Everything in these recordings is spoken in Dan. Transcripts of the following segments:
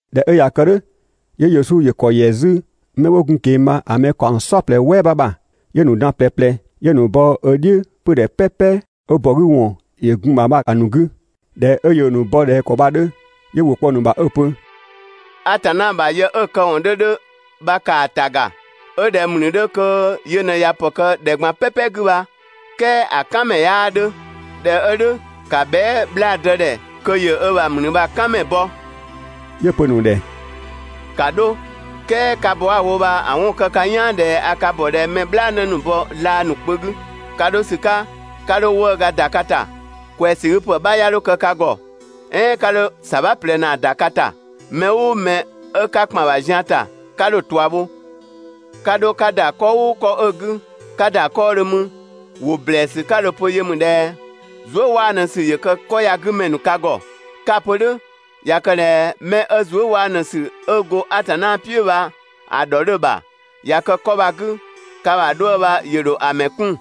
꞊Dhɛ 'ö ꞊ya kë "dhʋ̈, 'yö Yesu ‑yö ‑kɔ ‑yɛ 'zü 'mɛ 'wo gun‑ ꞊keng‑ bha‑ mɛ ‑kaɔng "saɔplɛ "wɛɛ 'bha ‑bha, 'yö‑ ‑nu dan ꞊plɛ ꞊plɛ, 'yö‑ ‑nu bɔ ö "dhiʋ̈ 'pödhɛ "pɛpɛ 'ö ‑bɔ 'gü ‑wɔn ‑yö gun‑ ‑bha bha‑ ‑nu 'gü. ꞊Dhɛ 'ö yöö‑ ‑nu bɔ ꞊dhɛ ‑kɔ bha‑ 'dhö, 'yö ‑wʋ kpɔ‑ ‑nu ‑bha 'ö‑ pö: «Atanna ‑bha yë 'ö‑ këwɔn 'dhö 'dhö bha ‑kaa ‑ta ‑ga. 'Ö ꞊dhɛ ‑mlü 'dhö kö yö ꞊në ꞊ya ‑pë kë ‑dhɛ ꞊gban "pɛpɛ 'gü bha, "kɛɛ ‑a "kan ‑mɛ 'yaa 'dhö. ꞊Dhɛ 'ö "dhʋ̈, ‑ka bhɛa" 'bhlaadë ‑dhɛ kö ‑yö ö ‑bha ‑mlü bha‑ "kan ‑mɛ bɔ.» 'Yö‑ pö‑ ‑nu ‑dhɛ: «‑Ka 'dho, "kɛɛ ka bɔ 'a‑ wo bha‑ 'wɔn kë ka "yaan ꞊dhɛ a ka ‑bɔ ꞊dhɛ mɛ "bhlaanë ‑nu bɔ laa ‑nu kpö 'gü. Ka 'dho ‑sü 'ka 'ka 'dho 'wëëga ‑da ka ‑ta, ꞊kwɛɛsügüpë 'bha 'ya 'dho kë ka ‑gɔ. "Ɛɛn 'ka 'dho ‑sabha ꞊plɛ ‑naa ‑da ka ‑ta. 'Mɛ "ʋʋ mɛ 'ö 'ka ‑kpan ‑bha zian ‑ta, 'ka 'dho‑ ꞊tua bho. 'Ka 'dho 'ka ‑da 'kɔ "ʋʋ 'kɔ 'ö‑ 'gü, 'ka ‑da 'kɔɔdhö 'mü, ‑wʋ ‑blɛɛsü 'ka dho‑ pö yö ‑mü ꞊dhɛ: «Zuëwaanusü ‑yö kë 'kɔ ya‑ 'gü ‑mɛ ‑nu ka ‑gɔ!» 'Ka‑ pö "dhʋ̈, ꞊ya kë ꞊dhɛ 'mɛ 'ö zuë" 'waanu ‑sü 'ö go Atanna "piʋ̈ bha‑ ‑dhɔ 'dhö‑ ‑bha ꞊ya kë 'kɔ bha‑ 'gü, ka ‑bha 'dhuë‑ bha ‑yö ‑dho ‑a ‑mɛ 'kun,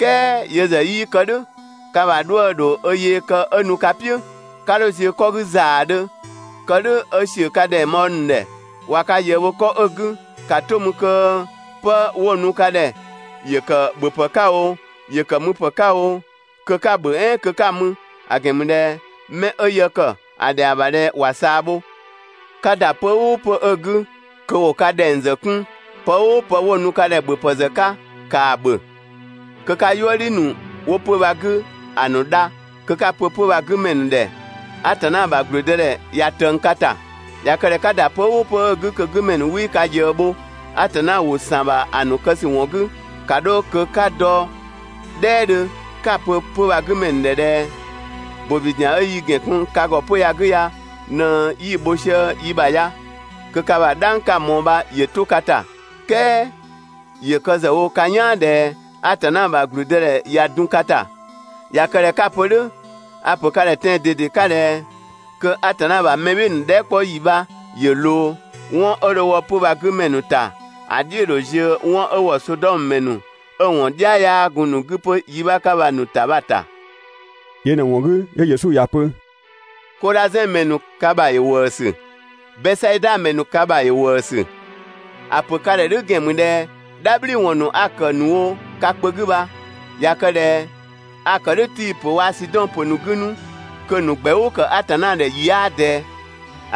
"kɛɛ yö ‑zë 'yii kë "dhʋ̈, ka ‑bha 'dhuë‑ ‑dho ö yee kë 'ö nu ka "piʋ̈. 'Ka 'dho ziö 'kɔ 'gü ‑zaadhö (kë "dhʋ̈ 'ö ‑siö ka ꞊dhɛng bhɔɔ ‑nu ‑dhɛ), ꞊wa ka ꞊yëë bho 'kɔ 'ö‑ 'gü, ‑ka 'to mü kö 'pë 'wo‑ nu ka ‑dhɛ, ‑yö ‑kë ‑bhöpë 'ka oo, ‑yö ‑kë müpë 'ka oo, kö 'ka‑ ‑bhö, "ɛɛn kö 'ka‑ mü; ‑a ‑gɛn ‑mü ꞊dhɛ 'mɛ 'ö yë ‑kë, ‑a ‑dhɛa ‑bha ꞊dhɛ ‑wa ꞊saa bho. 'Ka ‑da 'pö‑ "ʋʋ 'pö‑ 'ö‑ 'gü kö ‑wo ka ‑dhɛng ‑zë 'kun, pë "ʋʋ pë 'wo‑ nu ka ‑dhɛ ‑bhöpë ‑zë 'ka ‑kaa ‑bhö. Kö 'ka "yuëdhi ‑nu 'wo 'pö‑ bha‑ 'gü ‑a ‑nu dha, kö 'ka‑ pö 'pö‑ bha‑ 'gü ‑mɛ ‑nu ‑dhɛ: «Atanna ‑bha ‑gblüdëdhɛ ꞊ya ꞊tëng ka ‑ta.» ꞊Ya kë ꞊dhɛ 'ka ‑da 'pö‑ "ʋʋ 'pö‑ 'ö 'gü kö‑ 'gü ‑mɛ ‑nu 'wii ka ꞊yëë bho (Atanna ‑wʋ ‑san ‑bha ‑a ‑mɛ ‑nu kë ‑sü ‑wɔn 'gü), ‑ka 'dho kö 'ka dɔ "dhɛɛdhö 'ka‑ pö 'pö‑ bha‑ 'gü ‑mɛ ‑nu ‑dhɛ ꞊dhɛ: «‑Bobi ‑zian 'ö yi ‑gɛn kun ka ‑gɔ 'pö‑ ya‑ 'gü ya ꞊në 'yi‑ bho sië yi ‑bha ya, (kö ka ‑bha "dhang 'ka‑ ꞊mɔɔ bha ‑yö 'to ka ‑ta). "Kɛɛ ‑yö kë ‑zë wo ka "yaan ꞊dhɛ Atanna ‑bha ‑gblüdëdhɛ ꞊ya dun ka ‑ta. ꞊Ya kë ꞊dhɛ 'ka‑ pö "dhʋ̈, a‑ pö ka ‑dhɛ tɛan‑ ꞊dede 'ka ꞊dhɛ kö Atanna ‑bha mɛ "bhɩɩ‑ ‑nu dhɛɛ" 'kpɔ ‑yi bha ‑yö ꞊loo, 'wɔn 'ö dho wɔ 'pö‑ bha‑ 'gü ‑mɛ ‑nu ‑ta ‑a "dhiʋ̈ ‑dho ziö 'wɔn 'ö‑ ‑wɔ Sodɔmö ‑mɛ ‑nu ('ö‑ ‑wɔn "dhia 'yaa gun‑ ‑nu 'gü 'pö yi 'bha 'ka bha‑ ‑nu ‑ta) bha‑ ‑ta. Yö ꞊në‑ ‑wɔn 'gü 'yö Yesu ‑ya pö: «Kodhazɛn ‑mɛ ‑nu, ka 'vee‑! Bɛsaida ‑mɛ ‑nu, ka 'vee‑! ‑A ‑pö ka ‑dhɛ "dhʋ̈ ‑gɛn ‑mü ꞊dhɛ "dhabhliwɔn ‑nu 'a‑ ‑kë ‑nu wo ka kpö 'gü bha, ꞊ya kë ꞊dhɛ a‑ ‑kë "dhʋ̈ Tii‑ ‑pö waa‑ Sidɔn ‑pö ‑nu ꞊në‑ 'gü, kö‑ ‑nu ‑gbɛʋʋ kë Atanna ‑dhɛ ‑yi 'yaa ꞊dɛɛ.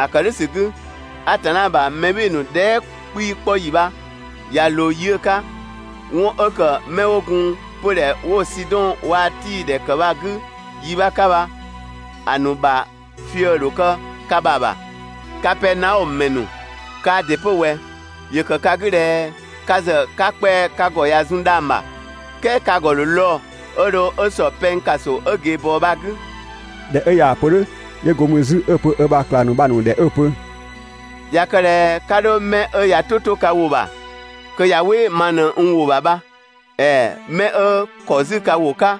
‑A ‑kë "dhʋ̈ ‑sü 'gü, Atanna ‑bha mɛ "bhɩɩ‑ ‑nu dhɛɛ" 'kpii‑ 'kpɔ ‑yi bha ꞊ya ꞊loo yi 'ö‑ 'ka, 'wɔn 'ö ‑kë 'mɛ 'wo gun 'pödhɛ 'wo‑ Sidɔn waa‑ Tii ‑pö ‑kë bha‑ 'gü yi 'bha 'ka bha‑ ‑nu 'ka bha‑ fië‑ ‑dho kë ka ‑bha ‑bha. Kapɛɛnaɔmö ‑mɛ ‑nu, kaa ‑dɩ 'pö ꞊wɛ! ‑Yö ‑kë ka 'gü ꞊dhɛ ka ‑zë 'ka kpɛa‑ ka ‑gɔ ꞊ya zun dhang‑ ‑bha, "kɛɛ ka ‑gɔ ‑dho lɔɔ‑ 'ö dho 'ö ‑sɔ pɛng ‑kaso 'ö ꞊geebɔɔ bha‑ 'gü. ꞊Dhɛ 'ö ꞊yaa‑ pö "dhʋ̈, 'yö go mü 'zü 'ö‑ pö ö bha ꞊klang ‑nu bha‑ ‑nu ‑dhɛ 'ö‑ pö: «꞊Ya kë ꞊dhɛ 'ka 'dho mɛ 'ö ꞊ya "tʋ 'to ka ‑wʋ ‑bha kö ꞊ya "wɩ ma ꞊në n ‑wʋ ‑bha bha, ‑ɛɛ 'mɛ 'ö ‑kɔ 'zü ka ‑wʋ 'ka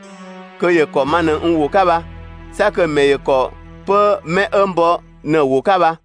kö ‑yö ‑kɔ ma ꞊në n ‑wʋ 'ka bha, 'sa kö‑ ‑mɛ ‑yö ‑kɔ 'pö 'mɛ 'ö n bɔ ꞊në‑ ‑wʋ 'ka bha.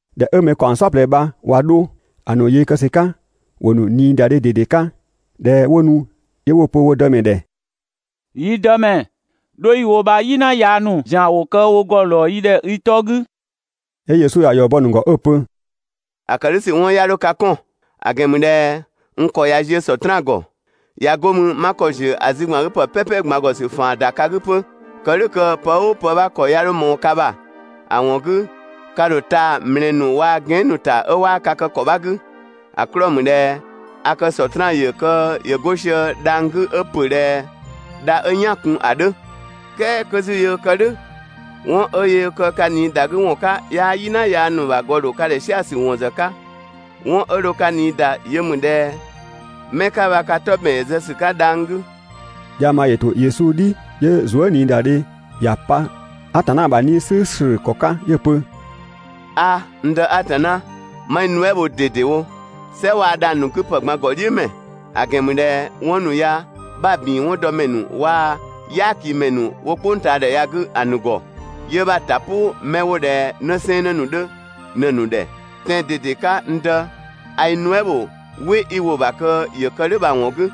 ꞊Dhɛ 'ö mɛ ‑kaɔng "saɔplɛ bha ꞊wa 'dho, ‑a ‑nu yee kë ‑sü 'ka ‑wo ‑nu ꞊niidadhe ꞊dede 'ka. ꞊Dhɛ 'wo nu 'yö 'wo‑ pö wo Dëmɛ ‑dhɛ: «Yi Dëmɛ, 'dho 'yi‑ wo bha "yina yaa ‑nu ‑zian ‑wo kë wo ‑gɔ ‑lɔɔ yi ‑dhɛ i 'tɔ 'gü!» 'Yö Yesu ‑ya ‑yɔ bɔ‑ ‑nu ‑gɔ 'ö‑ pö: «‑A ‑kë "dhʋ̈ ‑sü 'wɔn 'ya 'dho ka 'kɔn,) ‑a ‑gɛn ‑mü ꞊dhɛ n ‑kɔ ꞊ya ziö Sɔtraan ‑gɔ, ꞊ya 'go mü, 'ma ‑kɔ ‑ziö ‑a zü ‑gban 'gü ‑pë "pɛpɛ ꞊gban ‑gɔ ‑sü ‑faan ‑da ka 'gü 'pö, kë "dhʋ̈ kö pë "ʋʋ ‑pë 'bha ‑kɔ 'ya 'dho ꞊mɔɔ ka ‑bha, ‑a ‑wɔn 'gü ka ‑dho taa‑ ‑mlɛɛ ‑nu waa‑ gɛan" ‑nu ‑ta 'ö 'waa ka kë ‑kɔ 'bha 'gü, ‑a 'klɔɔ‑ ‑mü ꞊dhɛ a kë Sɔtraan yö kö ‑yö 'go sië dhang‑ 'gü 'ö ‑pö ꞊dhɛ dha 'ö "yaan‑ kun ‑a 'dhö.» "Kɛɛ 'kö 'zü yöö kë "dhʋ̈, 'wɔn 'ö yöö kë ka ꞊nii ‑da 'gü ‑wɔn 'ka 'yaa "yina yaa ‑nu ‑bha ‑gɔ ‑dho ka ‑dhɛ "sia‑ ‑wɔn ‑zë 'ka. 'Wɔn 'ö dho ka ꞊nii ‑da yö ‑mü ꞊dhɛ mɛ 'ka bha ka 'tɔ ‑bɛn ‑yö zë ‑sü 'ka dhang‑ 'gü. Dhiang bha ‑yö ‑to Yesu "dhi 'yö zuëniidadhe ‑ya pa Atanna ‑bha 'Nii‑ "slʋ̈ʋ̈slʋ̈ ‑kɔ 'ka 'yö‑ pö: «'A, n Dë Atanna, 'ma i nuɛ" bho ꞊dedewo, "sɛ waa‑ dhang‑ ‑a ‑nu 'gü ‑pë ꞊gban ‑gɔdhiʋ̈mɛ, ‑a ‑gɛn ‑mü ꞊dhɛ 'wɔn ‑nu ya 'bha‑ ‑bin 'wɔn dɔ ‑mɛ ‑nu waa‑ "yaakimɛ ‑nu 'wo "kpʋngtaadhɛ ya‑ 'gü ‑nu ‑gɔ, 'yö 'bha‑ ‑ta "pʋ 'mɛ 'wo ꞊dhɛ 'në 'sɛɛnnë ‑nu 'dhö ꞊në‑ ‑nu ‑dhɛ. Tɛan‑ ꞊dede 'ka, n Dë, a i nuɛ" ‑bho "wɩ 'i‑ wo‑ bha kö ‑yö kë "dhʋ̈ bha‑ ‑wɔn 'gü.»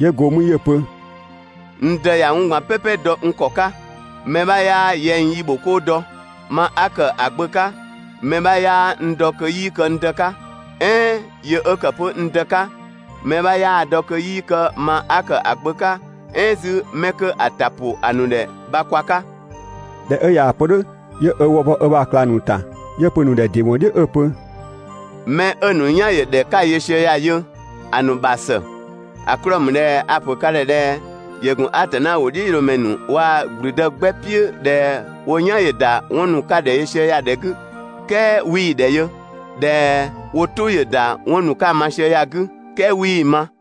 'Yö go 'mü 'yö‑ pö: «N Dë ꞊ya 'wɔn ꞊gban "pɛpɛ dɔ n ‑kɔ 'ka, mɛ 'bha 'yaa yɛng yi ‑bho "kʋʋ dɔ. Ma 'a ‑kë ‑a Gbö 'ka, mɛ 'bha 'yaa n dɔ kö 'yii kë n Dë 'ka, "ɛɛn yö 'ö ‑kë 'pö n Dë 'ka, mɛ 'bha 'yaa‑ dɔ kö 'yii kë ma 'a kë ‑a Gbö 'ka, "ɛɛn 'zü 'mɛ 'kö 'a‑ ‑ta ‑pʋ ‑a ‑nu ‑dhɛ bha kwa 'ka.» ꞊Dhɛ 'ö ꞊yaa‑ pö "dhʋ̈, 'yö ö wë bɔ ö ‑bha ꞊klang ‑nu ‑ta, 'yö‑ pö‑ ‑nu ‑dhɛ ‑dɩ ‑wɔn "dhiʋ̈ 'ö‑ pö: «'Mɛ 'ö‑ ‑nu "yan ‑yö ‑dhɛ 'ö 'ka yö sië ya‑ yö, ‑a ‑nu ‑bha ‑së! ‑A 'klɔɔ‑ ‑mü ꞊dhɛ a‑ ‑pö ka ‑dhɛ ꞊dhɛ ‑yö ‑gun Atanna ‑wʋdhiʋ̈loomɛ ‑nu waa‑ ‑gblüdë 'gbɛ "piʋ̈ ꞊dhɛ wo "yan ‑yö ‑da 'wɔn ‑nu 'a‑ ‑kë ka‑ ‑dhɛ yö sië ya‑ ‑dhɛ 'gü, "kɛɛ 'wii‑ ‑dhɛ yö, ꞊dhɛ wo "tʋ ‑yö ‑da 'wɔn ‑nu 'ka‑ ma sië ya‑ 'gü, "kɛɛ 'wii‑ ma.»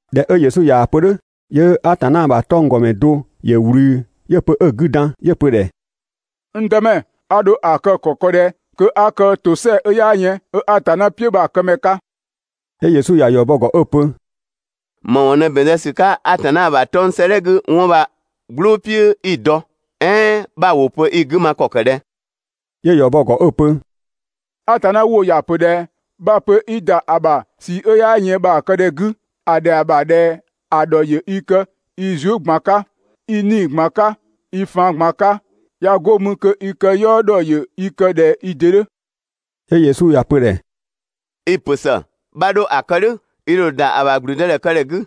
꞊Dhɛ 'ö Yesu ꞊yaa‑ pö "dhʋ̈, 'yö Atanna ‑bha 'tɔnggɔmɛ do ‑yö ꞊wlü 'yö‑ pö 'ö‑ 'gü dan 'yö‑ pö‑ ‑dhɛ: «N Dëmɛ, a ‑dho ‑a kë ‑kɔ kë ꞊dhɛ kö 'a kë ‑tosɛa 'ö 'yaa yën 'ö Atanna "piʋ̈ bha‑ kë ‑mɛ 'ka?» 'Yö Yesu ‑ya ‑yɔ bɔ‑ ‑gɔ 'ö‑ pö: «‑Më ‑wɔn ꞊në ‑bɛn zë ‑sü 'ka Atanna ‑bha 'tɔng‑ 'sëëdhɛ 'gü 'wɔn bha‑ "gblʋʋ "piʋ̈ 'i‑ dɔ, "ɛɛn 'bha‑ ‑wʋ pö i‑ 'gü ma ‑kɔ ‑kë ꞊dhɛ?» 'Yö ‑yɔ bɔ‑ ‑gɔ 'ö‑ pö: «Atanna ‑wʋ ‑ya ‑pö ꞊dhɛ: Bha‑ pö 'i ‑da ‑a ‑bha ꞊sii 'ö 'yaa yën bha‑ kë ‑dhɛ 'gü, ‑a ‑dhɛa ‑bha ꞊dhɛ ‑a ‑dhɔ ‑yö i kë i zuë" ꞊gban 'ka, i 'nii‑ ꞊gban 'ka, i faan ꞊gban 'ka, ꞊ya 'go mü kö i këyɔɔ ‑dhɔ ‑yö i kë ꞊dhɛ i ‑dɩ 'dhö.» 'Yö Yesu ‑ya pö‑ ‑dhɛ: «I‑ ‑pö ‑së, 'bha 'dho ‑bhö ‑a kë "dhʋ̈, i ‑dho ‑da ‑bha ‑gblüdëdhɛkëdhɛ 'gü.»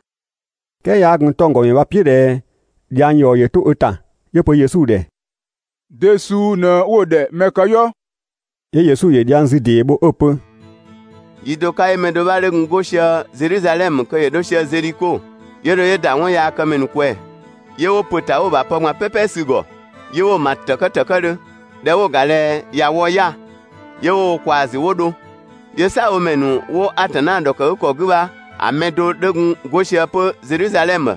"Kɛɛ 'yaa gun 'tɔnggɔmɛ bha‑ "piʋ̈ ꞊dhɛ dhiang ‑yɔ ‑yö 'to ö ‑ta, 'yö‑ pö Yesu ‑dhɛ: «De suu ꞊në 'wo‑ ‑dhɛ mɛ këyɔɔ?» 'Yö Yesu ‑yö dhiang zü ‑dee bho 'ö‑ pö: «Yi do 'ka 'yö mɛ do 'bha 'dhö gun 'go sië Zedhizadhɛmö kö ‑yö 'dho sië Zedhiko. 'Yö dho 'yö ‑da 'wɔnyaakëmɛ ‑nu ꞊kwɛɛ‑. 'Yö 'wo ‑pö ‑ta 'wo‑ ‑bha pë ꞊gban "pɛpɛ sü‑ ‑gɔ, 'yö 'wo‑ ‑ma ‑tëkë ‑tëkëdhö. ꞊Dhɛ 'wo‑ ‑ga ꞊dhɛ ꞊ya wɔ 'ya‑ 'yö 'wo wo ꞊kwaa‑ ‑zü 'wo dho. 'Yö "saabhomɛ ‑nu 'wo Atanna ‑dhɔkëgükɔ 'gü bha‑ mɛ do 'dhö gun 'go sië 'pö Zedhizadhɛmö,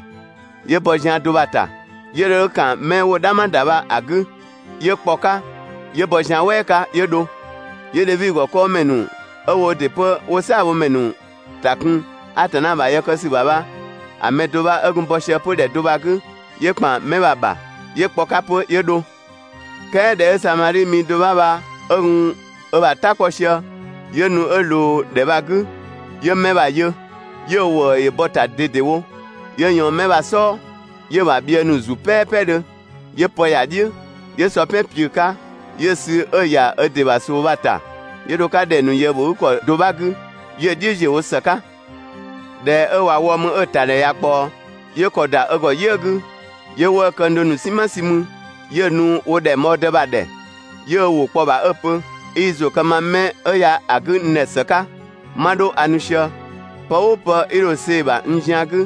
'yö bɔ zian do bha‑ ‑ta, 'yö dho 'yö ‑kan 'mɛ 'wo‑ "dhama ‑da bha‑ 'gü, 'yö kpɔ‑ 'ka 'yö bɔ zian "wɛɛ 'ka 'yö dho. 'Yö Dhevi ‑gɔ 'kɔɔmɛ ‑nu ('ö woo ‑dɩ 'pö 'wo "saabhomɛ ‑nu ‑ta kun Atanna ‑bha yë kë ‑sü ‑bha) bha‑ mɛ do 'bha 'ö gun bɔ sië 'pö ‑dhɛ do bha‑ 'gü, 'yö ‑kpan 'mɛ bha‑ ‑bha. 'Yö kpɔ‑ 'ka 'pö 'yö dho. "Kɛɛ ꞊dhɛ 'ö Samadhi mi do 'bha bha 'ö gun ö bha "ta 'kpɔ sië, 'yö nu 'ö ꞊loo ‑dhɛ bha‑ 'gü 'yö 'mɛ bha‑ yö, 'yö ‑wëë ‑yö bɔ‑ ‑ta ꞊dedewo. 'Yö ꞊yɔɔn 'mɛ bha‑ "sɔɔ 'yö‑ ‑bha bhië ‑nu ‑zu "pɛɛpɛdhö, 'yö pë ‑ya "dhiʋ̈, 'yö sɔ "pɛn ꞊piʋ̈‑ 'ka, 'yö‑ sü 'ö‑ ‑ya ö ‑dɩ ‑bha ꞊soo bha‑ ‑ta, 'yö dho‑ 'ka ‑dhɛng ‑nu ꞊yëëbhogükɔ do 'bha 'gü, 'yö‑ "dhiʋ̈ ‑ziö wo ‑së 'ka. ꞊Dhɛ 'ö ꞊wa wɔ mü 'ö‑ ‑ta ‑dhɛ ꞊ya ꞊kpaɔ, 'yö ‑kɔ ‑da ö ‑gɔ "yië‑ 'gü, 'yö 'wëë‑ këng do ‑nu "sinma sü 'mü, 'yö‑ nu wo ‑dhɛngbhɔɔdë bha‑ ‑dhɛ, 'yö ö ‑wʋ kpɔ‑ ‑bha 'ö‑ pö: «'I i ‑zʋ kë ma mɛ ya‑ 'gü n ‑dhɛ ‑së 'ka. 'Ma 'dho a nu sië, 'pë ʋʋ pë 'i dho‑ see‑ ‑bha n zian 'gü,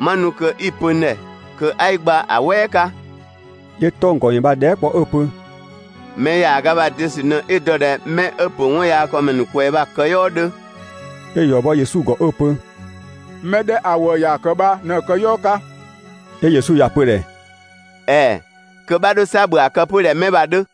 'ma nu kö 'i‑ pö n ‑dhɛ kö 'a i gba‑ "wɛɛ 'ka.» 'Yö 'tɔnggɔmɛ bha‑ dhɛɛ" kpɔ 'ö‑ pö: «Mɛ ‑yaaga bha‑ de ‑sü ꞊në 'i‑ dɔ ꞊dhɛ 'mɛ 'ö ‑pö 'wɔnyaakëmɛ ‑nu ꞊kwɛɛ‑ bha‑ këyɔɔ 'dhö?» 'Yö‑ ‑yɔ bɔ Yesu ‑gɔ 'ö‑ pö: «Mɛ 'dhɛ ‑a ‑wëë ‑ya ‑kë bha ꞊në‑ këyɔɔ 'ka.» 'Yö Yesu ‑ya pö‑ ‑dhɛ: «‑Ɛɛ, kö 'bha 'dho 'sa ‑bhö ‑a kë 'pö ꞊dhɛ 'mɛ bha‑ 'dhö!»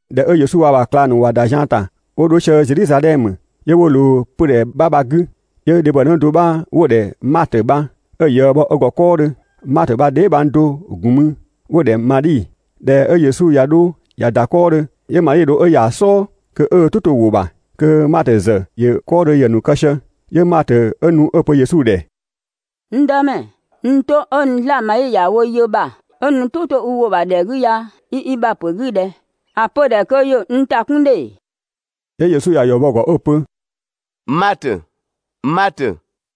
꞊Dhɛ 'ö Yesu waa‑ ö ‑bha ꞊klang ‑nu ꞊wa ‑da zian ‑ta 'wo 'dho sië Zedhizadhɛmö, 'yö 'wo ꞊loo 'pödhɛ 'bha bha‑ 'gü, 'yö dhebhɔnë do 'bha 'wo‑ ‑dhɛ Matö bha, 'ö‑ ꞊yëë bho ö ‑gɔ 'kɔɔdhö. Matö bha‑ dheebhang do‑ ‑gun mü 'wo‑ ‑dhɛ Madhi. ꞊Dhɛ 'ö Yesu ꞊ya 'dho ꞊ya ‑da 'kɔɔdhö, 'yö Madhi dho 'ö ‑ya ‑a "sɔɔ kö 'ö ö "tʋ 'to‑ ‑wʋ ‑bha. Kö Matö ‑zë ‑yö 'kɔɔdhö ‑yë ‑nu kë sië, 'yö Matö nu 'ö‑ pö Yesu ‑dhɛ: «N Dëmɛ, n 'to 'ö n 'zlaa‑ Madhi ‑ya wo yë ‑bha 'ö nu "tʋ ‑to i ‑wʋ ‑bha ‑dhɛ 'gü ya i i ‑bha ‑pö 'gü ꞊dhɛ? ‑A pö‑ ‑dhɛ kö ‑yö n ‑ta 'kun ‑dhe!» 'Yö Yesu ‑ya ‑yɔ bɔ‑ ‑gɔ 'ö‑ pö: «Matö n "tɛado,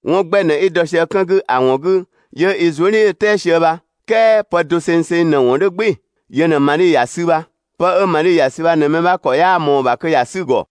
'wɔn 'gbɛ ꞊në 'i dɔ sië 'kën 'gü ‑a ‑wɔn 'gü 'yö i zuëdhiʋ̈tɛɛ sië bha, "kɛɛ pë dosengseng ꞊në‑ ‑wɔn 'dhö "gbɩɩ‑, yö ꞊në Madhi ‑ya sü bha. 'Pë 'ö Madhi ‑ya ‑sü bha ꞊në mɛ 'bha ‑kɔ 'yaa ꞊mɔɔ‑ ‑bha kö ‑ya 'sü‑ ‑gɔ.